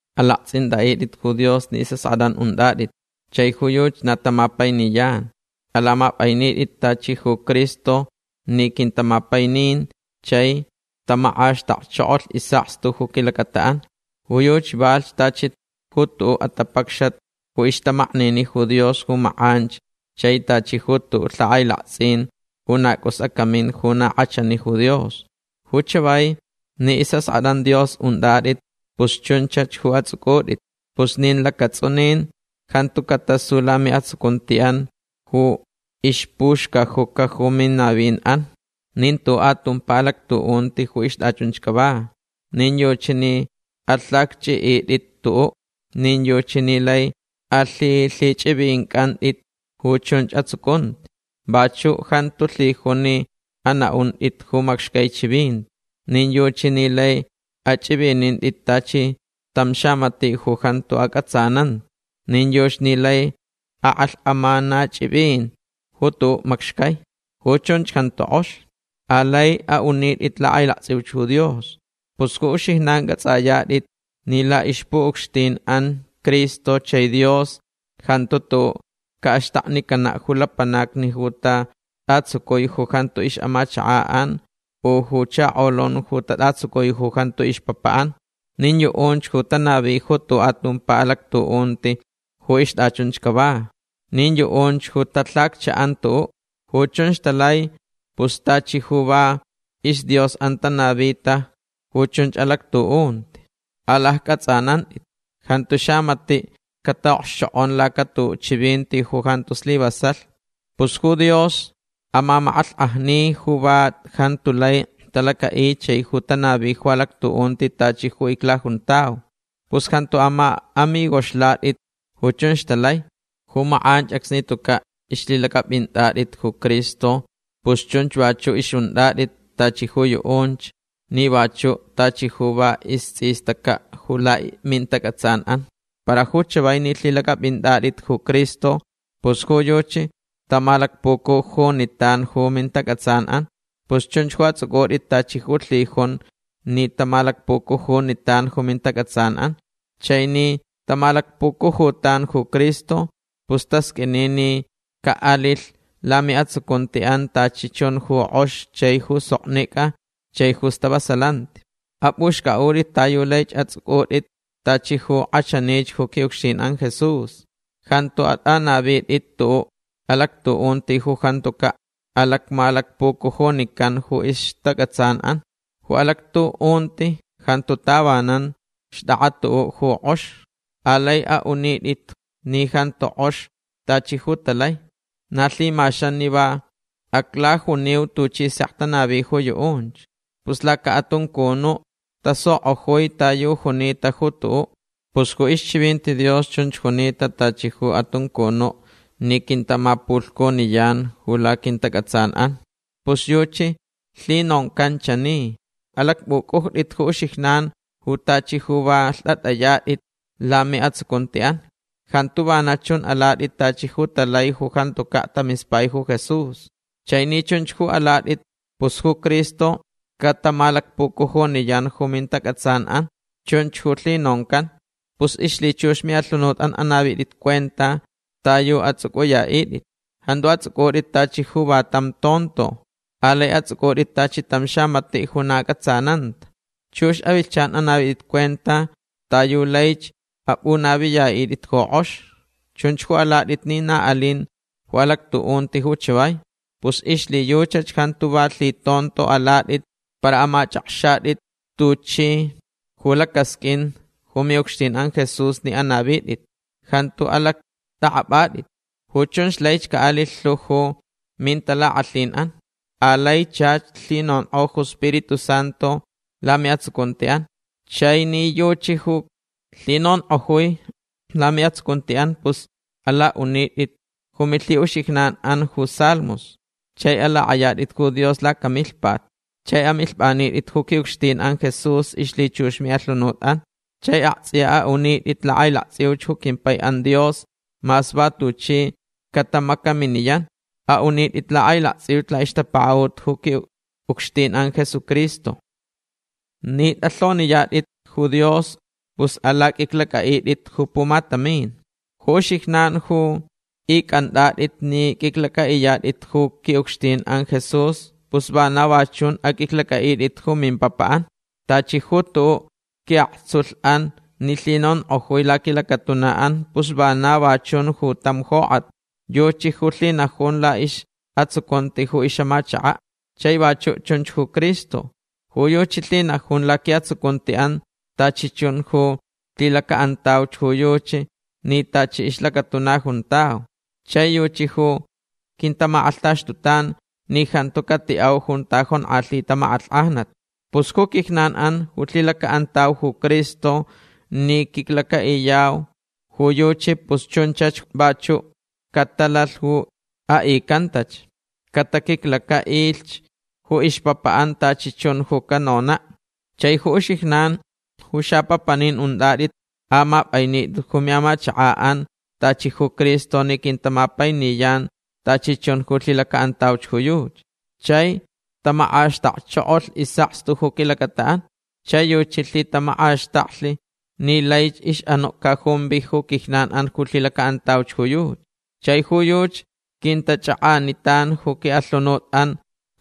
Alaktsʼintʼaʼitʼit ju Dios ni isʼaskʼatʼan untʼatʼit chai ju yuchi na tamapainiyan. Alamapʼainitʼit tachi ju Cristo ni quintamapaininch chai tamakʼaxtakchokolh isʼakstu ju quilacataʼan. Ju yuchi valhch tachi ju tuʼuʼ atapacxat ju ixtamaknini ju Dios ju makʼanch chai tachi ju tuʼuʼ lhakʼailaktsʼin ju na cʼus acamin ju na kʼachani ju Dios. Ju chavai ni isʼaskʼatʼan Dios untʼatʼit pus chunchach ju atsʼucʼutʼit. Pus nin lacatsʼunin jantu catasu lamiʼatsucuntiʼan ju ixpuxcajuca ju minavinʼan. Nin tuʼuʼ atumpa alactuʼunti ju ixtʼachunch cava. Nin yuchi ni alhacchʼiʼitʼit tuʼuʼ. Nin yuchi ni lai alhilhichʼivincʼantʼit ju chunch atsucunti. Vachuʼ jantu lhijun ni anaʼuntʼit ju macxcai chivinti. Nin yuchi ni lai achʼivinintʼit tachi tam xamatiʼ ju jantu acʼatsananta. Nin yuchi ni lai akʼalhkʼamanachʼivin ju tuʼuʼ macxcai. Ju chunch jantu kʼox. Alai aʼunitʼit lakʼailaktsʼiuch ju Dios. Pus ju uxijnan cʼatsʼayatʼit ni laʼixpuʼucxtinʼan Cristo chai Dios jantu tuʼuʼ caʼaxtaknicanaʼ ju lapanacni ju tatʼatsucui ju jantu ixʼamachakaʼan u ju chakolun ju tatʼatsucui ju jantu ixpapaʼan. Nin yuʼunch ju tanavi ju tuʼuʼ atumpa alactuʼunti ju ixtʼachunch cava. Nin yuʼunch ju talhacchaʼan tuʼuʼ. Ju chunch talai pus tachi ju va isdiosʼan tanavita ju chun alactuʼunti. Alaccʼatsʼanantʼit. Jantu xamatiʼ cataʼokxchokʼon lacatuʼuʼ chivinti ju jantu slivasalh. Pus ju Dios amamakʼalhkʼajni ju va jantu lai talacaʼi chai ju tanavi ju alactuʼunti tachi ju iclajuntau. Pus jantu amaʼamigoxlatʼit ju chunch talai. Ju makʼanch acsni tucaʼ ixlhilacʼapʼintʼatʼit ju Cristo pus chunch vachuʼ ixʼuntʼatʼit tachi ju yuʼunch ni vachuʼ tachi ju va istsʼistacaʼ ju lamintacʼatsanʼan. Para ju chavai ni lhilacʼapʼintʼatʼit ju Cristo pus ju yuchi tamalacpucujunitan ju mintacʼatsanʼan. Pus chunch ju atsʼucʼutʼit tachi ju lhijun ni tamalacpucujunitan ju mintacʼatsanʼan. Chai ni tamalacpucujutan ju Cristo pus tasqʼuini ni caʼalilhch lamiʼatsucuntiʼan tachi chun ju kʼox chai ju soknicʼa chai ju stavasalanti. Apʼuxcʼaʼutʼit ta yu laich atsʼucʼutʼit tachi ju kʼachanich ju quiʼucxtinʼan Jesús. Jantu atʼanavitʼit tuʼuʼ alactuʼunti ju jantucaʼ alacmalacpucujunicanta ju ixtacʼatsanʼan. Ju alactuʼunti jantu tavanan xtʼakʼa tuʼuʼ ju kʼox. Alai aʼunitʼit ni jantu kʼox tachi ju talai. Na lhimaxan ni va aclajuniu tuchi sek tanavi ju yuʼunch. Pus lacaʼatuncunuʼ tasukʼojui ta yu junita ju tuʼuʼ. Pus ju ixchivinti Dios chunch junita tachi ju atuncunuʼ ni quintamapulhcuniyan ju laquintacʼatsanʼan. Pus yuchi lhinoncan chani: Alacpʼucʼujtʼitch ju uxijnan ju tachi ju va lhtʼatʼayatʼit lamiʼatsucuntiʼan. Jantu vana chun alatʼit tachi ju talai ju jantucaʼ tamispai ju Jesús. Chai ni chunch ju alatʼit pus ju Cristo catamalacpucujuniyan ju mintacʼatsanʼan. Chunch ju lhinoncan. Pus ixlhichux miʼalhunutʼan anavitʼit cuenta ta yu atsʼucʼuyaʼitʼit. Jantu atsʼucʼutʼit tachi ju va tam tonto. Alai atsʼucʼutʼit tachi tam xamatiʼ ju na acʼatsananta. Chux avilhchan anavitʼit cuenta ta yu laich apʼunaviyaʼitʼit ju kʼox. Chun ju alatʼit ni na alin ju alactuʼunti ju chavai. Pus ixlhiyuchach jantu va lhitonto alatʼit para amachʼakxatʼit tuchi ju lacasqʼuin ju miʼucxtinʼan Jesús ni anavitʼit. Jantu alactʼakʼapʼatʼit. Ju chunch laich caʼalilh lhu ju mintalakʼalhinʼan. Alai chach lhinonkʼo ju Spiritu Santu lamiʼatsucuntiʼan. Chai ni yuchi ju lhinonkʼojui lamiʼatsucuntiʼan pus alaʼunitʼit ju milhiʼuxijnanʼan ju salmos. Chai alakʼayatʼit ju Dios lacamilhpat. Chai amilhpʼanitʼit ju quiʼucxtinʼan Jesús ixlhichux miʼalhunutʼan. Chai aktsʼiya aʼunitʼit lakʼailaktsʼiuch ju quimpaiʼan Dios mas va tuchi catamacaminiyan. Aʼunitʼit lakʼailaktsʼiuch laʼixtapakaʼut ju quiʼucxtinʼan Jesucristo. Ni tʼalhoniyatʼit ju Dios pus alaqʼuiclacʼaʼitʼit ju pumatamin. Ju uxijnan ju icʼantʼatʼit ni qʼuiclacʼaʼiyatʼit ju quiʼucxtinʼan Jesús pus vana va chun aqʼuiclacʼaʼitʼit ju mimpapaʼan. Tachi ju tuʼuʼ quiʼaktsulhʼan ni lhinonkʼojui laquilacatunaʼan pus vana va chun ju tam jokʼat. Yuchi ju lhinajun laʼisʼatsucunti ju ixʼamachakaʼ. Chai vachuʼ chunch ju Cristo. Ju yuchi lhinajun laquiʼatsucuntiʼan tachi chun ju lhilacaʼantauch ju yuchi ni tachi ixlacatuna juntau. Chai yuchi ju quintamakʼalhtaxtutan ni jantu catiʼau junta jonkʼalhita makʼalhkʼajnat. Pus ju quijnanʼan ju lhilacaʼantau ju Cristo ni quiclacaʼiyau ju yuchi pus chunchach vachuʼ catalalh ju aʼicantach. Cataquiclacaʼilh ju ixpapaʼan tachi chun ju canonaʼ. Chai ju uxijnan ju xapapanin untʼatʼit amapʼainitʼit ju miʼamachakaʼan tachi ju Cristo ni quintamapainiyan tachi chun ju lhilacaʼantauch ju yuchi. Chai tamakʼaxtakchokolh isʼakstu ju quilacataʼan. Chai yuchi lhitamakʼaxtaklh ni laich ixʼanuʼ cajumvi ju quijnanʼan ju lhilacaʼantauch ju yuchi. Chai ju yuchi quintachakʼanitan ju quiʼalhunutʼan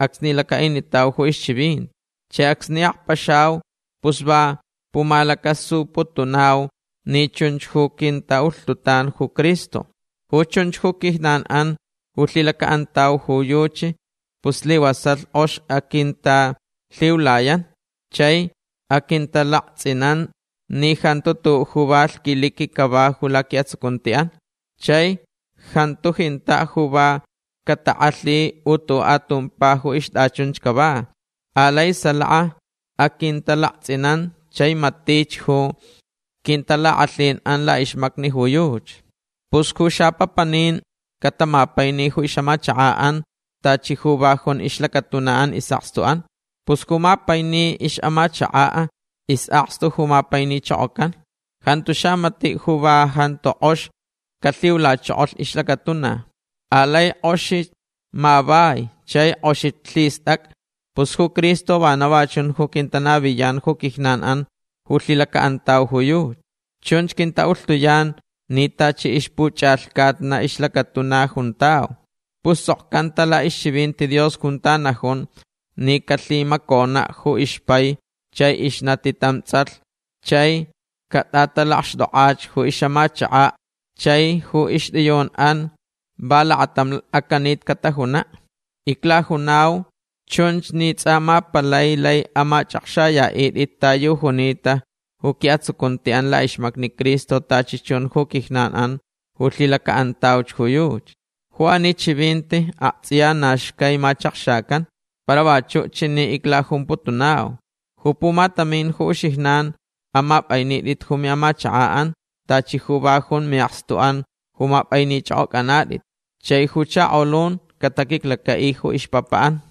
acsni lacaʼinitau ju ixchivinti. Chai acsni akpaxau pus va pumalacasuputunau ni chunch ju quintaʼulhtutan ju Cristo. Ju chunch ju quijnanʼan ju lhilacaʼantauch ju yuchi pus slivasalh kʼox aquintalhiulayan. Chai aquintalaktsʼinan ni jantu tuʼuʼ ju va lhquiliqui cava ju laquiʼatsucuntiʼan. Chai jantu jintaʼ ju va catakʼalhi u tuʼuʼ atumpa ju ixtʼachunch cava. Alai salaka aquintalaktsʼinan chai matich ju quintalakʼalhinʼan laʼixmacni ju yuchi. Pus ju xapapanin catamapaini ju ixʼamachakaʼan tachi ju va jun ixlacatunaʼan isʼakstuʼan. Pus ju mapaini ixʼamachakaʼ isʼakstu ju mapainichokocan. Jantu xamatiʼ ju va jantu kʼox calhiulachokolh ixlacatuna. Alai kʼoxich mavai chai kʼoxich lhistʼacʼa. Pus ju Cristo vana va chun ju quintanaviyan ju quijnanʼan ju lhilacaʼantauch ju yuchi. Chunch quintaʼulhtuyan ni tachi ixpuchʼalhcatna ixlacatuna juntau. Pus tsʼokcanta laʼixchivinti Dios junta najun ni calhimaconaʼ ju ixpai chai ixnati tam tsʼalh chai catʼatalakxtʼokʼach ju ixʼamachakach chai ju ixtʼiyunʼan va lakatam acanit catajunaʼ. Iclajunau chunch ni tsʼa ma palai lai amachʼakxayaʼitʼit ta yu junita ju quiʼatsucuntiʼan laʼixmacni Cristo tachi chun ju quijnanʼan ju lhilacaʼantauch ju yuchi. Ju ani chivinti aktsʼiya na xcai machakxacan. Para vachuʼ chani iclajumputunau. Ju pumatamin ju uxijnan amapʼainitʼit ju miʼamachakaʼan tachi ju va jun miʼakstuʼan ju mapʼainichʼokʼocʼanatʼit. Chai ju chakolun cataquiclacaʼi ju ixpapaʼan.